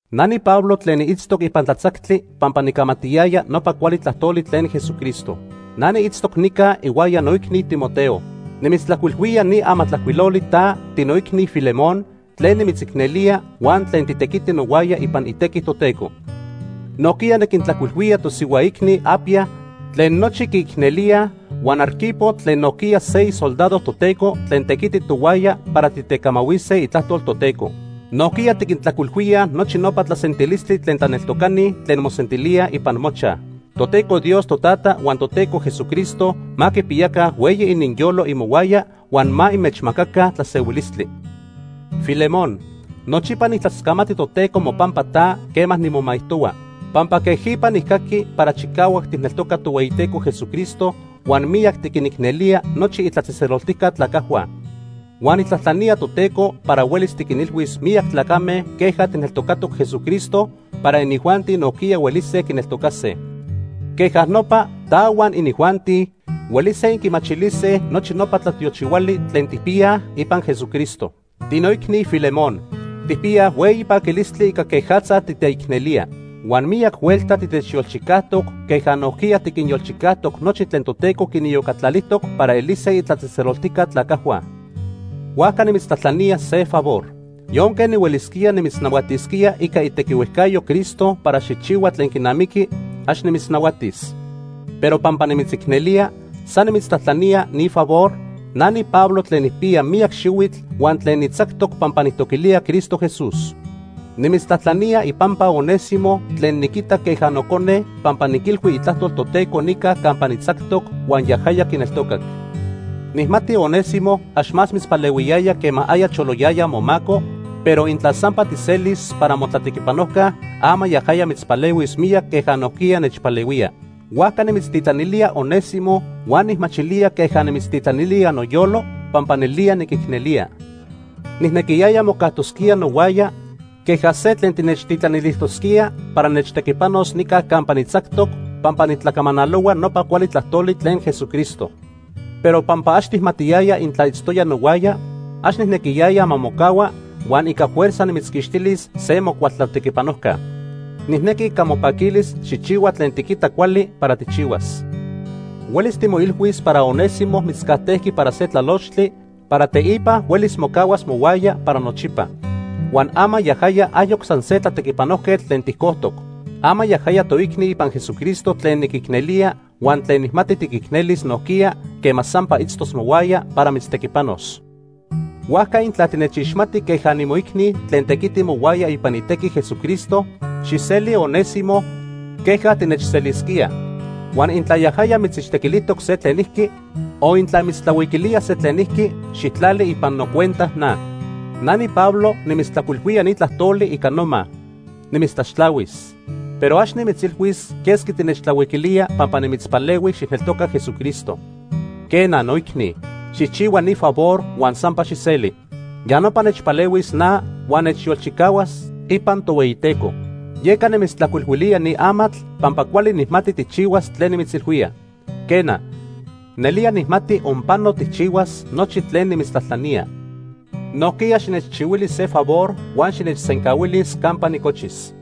Na niPablo tlen niitztoc ipan tlatzactli pampa nicamatiyaya nopa cuali tlajtoli tlen Jesucristo. Na niitztoc nica ihuaya noicni Timoteo. Nimitztlajcuilhuía ni amatlajcuiloli ta, tinoicni Filemón, tlen nimitzicnelía huan tlen titequiti nohuaya ipan itequi Toteco. Nojquiya niquintlajcuilhuía tosihua icni Apia tlen nochi quiicnelíaj, huan Arquipo tlen nojquiya se isoldado Toteco tlen tequiti tohuaya para titecamahuise itlajtol Toteco. Nojquiya tiquintlajcuilhuíaj nochi nopa tlasentilistli tlen tlaneltocani tlen mosentilíaj ipan mochaj. Toteco Dios Totata huan Toteco Jesucristo ma quipiyaca hueyi ininyolo imohuaya huan ma inmechmacaca tlasehuilistli. Filemón, nochipa nijtlascamati Toteco mopampa ta quema nimomaijtohua, pampa quejipa nijcaqui para chicahuac tijneltoca Tohueyiteco Jesucristo huan miyac tiquinicnelía nochi itlatzejtzeloltijca tlacajhua. Huan nijtlajtlanía Toteco para huelis tiquinilhuis miyac tlacame queja tijneltocatoc Jesucristo para inijuanti nojquiya huelise quineltocase. Queja nopa ta huan inijuanti huelise inquimachilise nochi nopa tlatiochihuali tlen tijpiyaj ipan Jesucristo. Tinoicni Filemón, tijpiyaj hueyi paquilistli ica quejatza titeicnelía. Huan miyac huelta titechyolchicajtoc queja nojquiya tiquinyolchicajtoc nochi tlen Toteco quiniyocatlalijtoc para elise itlatzejtzeloltijca tlacajhua. Huajca nimitztlajtlanía se favor. Yonque nihuelisquía nimitznahuatisquía ica itequihuejcayo Cristo para xijchihua tlen quinamiqui, ax nimitznahuatis. Pero pampa nimitzicnelía, san nimitztlajtlanía ni favor, na niPablo tlen nijpiya miyac xihuitl, huan tlen nitzactoc pampa nijtoquilía Cristo Jesús. Nimitztlajtlanía ipampa Onésimo tlen niquita queja nocone pampa niquilhui itlajtol Toteco nica campa nitzactoc huan yajaya quineltocac. Nijmati Onésimo ax más mitzpalehuiyaya quema aya choloyaya momaco, pero intla sampa tijselis para motlatequipanojca, ama yajaya mitzpalehuis miyac queja nojquiya nechpalehuía. Huajca nimitztitlanilía Onésimo huan nijmachilía queja nimitztitlanilía noyolo pampa nelía niquicnelía. Nijnequiyaya mocajtosquía nohuaya queja se tlen tinechtitlanilijtosquía para nechtequipanos nica campa nitzactoc pampa nitlacamanalohua nopa cuali tlajtoli tlen Jesucristo. Pero pampa ax tijmatiyaya intla itztoya nohuaya, ax nijnequiyaya ma mocahua huan ica fuerza nimitzquixtilis se mocual tlatequipanojca. Nijnequi ica mopaquilis xijchihua tlen tiquita cuali para tijchihuas. Huelis timoilhuis para Onésimo mitzcajtejqui para se tlalochtli para teipa huelis mocahuas mohuaya para nochipa. Huan ama yajaya ayoc san se tlatequipanojquetl tlen tijcojtoc. Ama yajaya toicni ipan Jesucristo tlen niquicnelía huan tlen nijmati tiquicnelis nojquiya quema sampa itztos mohuaya para mitztequipanos. Huajca intla tinechixmati queja nimoicni tlen tequiti mohuaya ipan itequi Jesucristo, xijseli Onésimo queja tinechselisquía. Huan intla yajaya mitzixtequilijtoc se tlenijqui o intla mitztlahuiquilía se tlenijqui, xijtlali ipan nocuenta na. Na niPablo nimitztlajcuilhuía ni tlajtoli ica noma: Nimitztlaxtlahuis. Pero ax nimitzilhuis quesqui tinechtlahuiquilía pampa nimitzpalehui xijneltoca Jesucristo. Quena noicni, xijchihua ni favor huan sampa xijseli. Ya nopa nechpalehuis na huan nechyolchicahuas ipan Tohueyiteco. Yeca nimitztlajcuilhuilía ni amatl pampa cuali nijmati tijchihuas tlen nimitzilhuía. Quena, nelía nijmati onpano tijchihuas nochi tlen nimitztlajtlanía. Nojquiya xinechchihuili se favor huan xinechsencahuilis campa nicochis.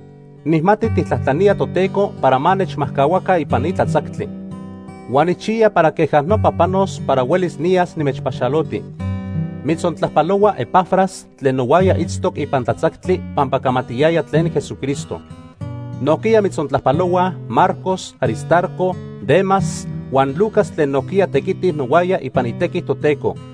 Nijmati tijtlajtlanía Toteco para ma nechmajcahuaca ipan ni tlatzactli. Huan nijchiya para queja nopa panos para huelis niyas nimechpaxaloti. Mitzontlajpalohua Epafras tlen nohuaya itztoc ipan tlatzactli pampa camatiyaya tlen Jesucristo. Nojquiya mitzontlajpalohuaj Marcos, Aristarco, Demas huan Lucas tlen nojquiya tequitij nohuaya ipan itequi Toteco.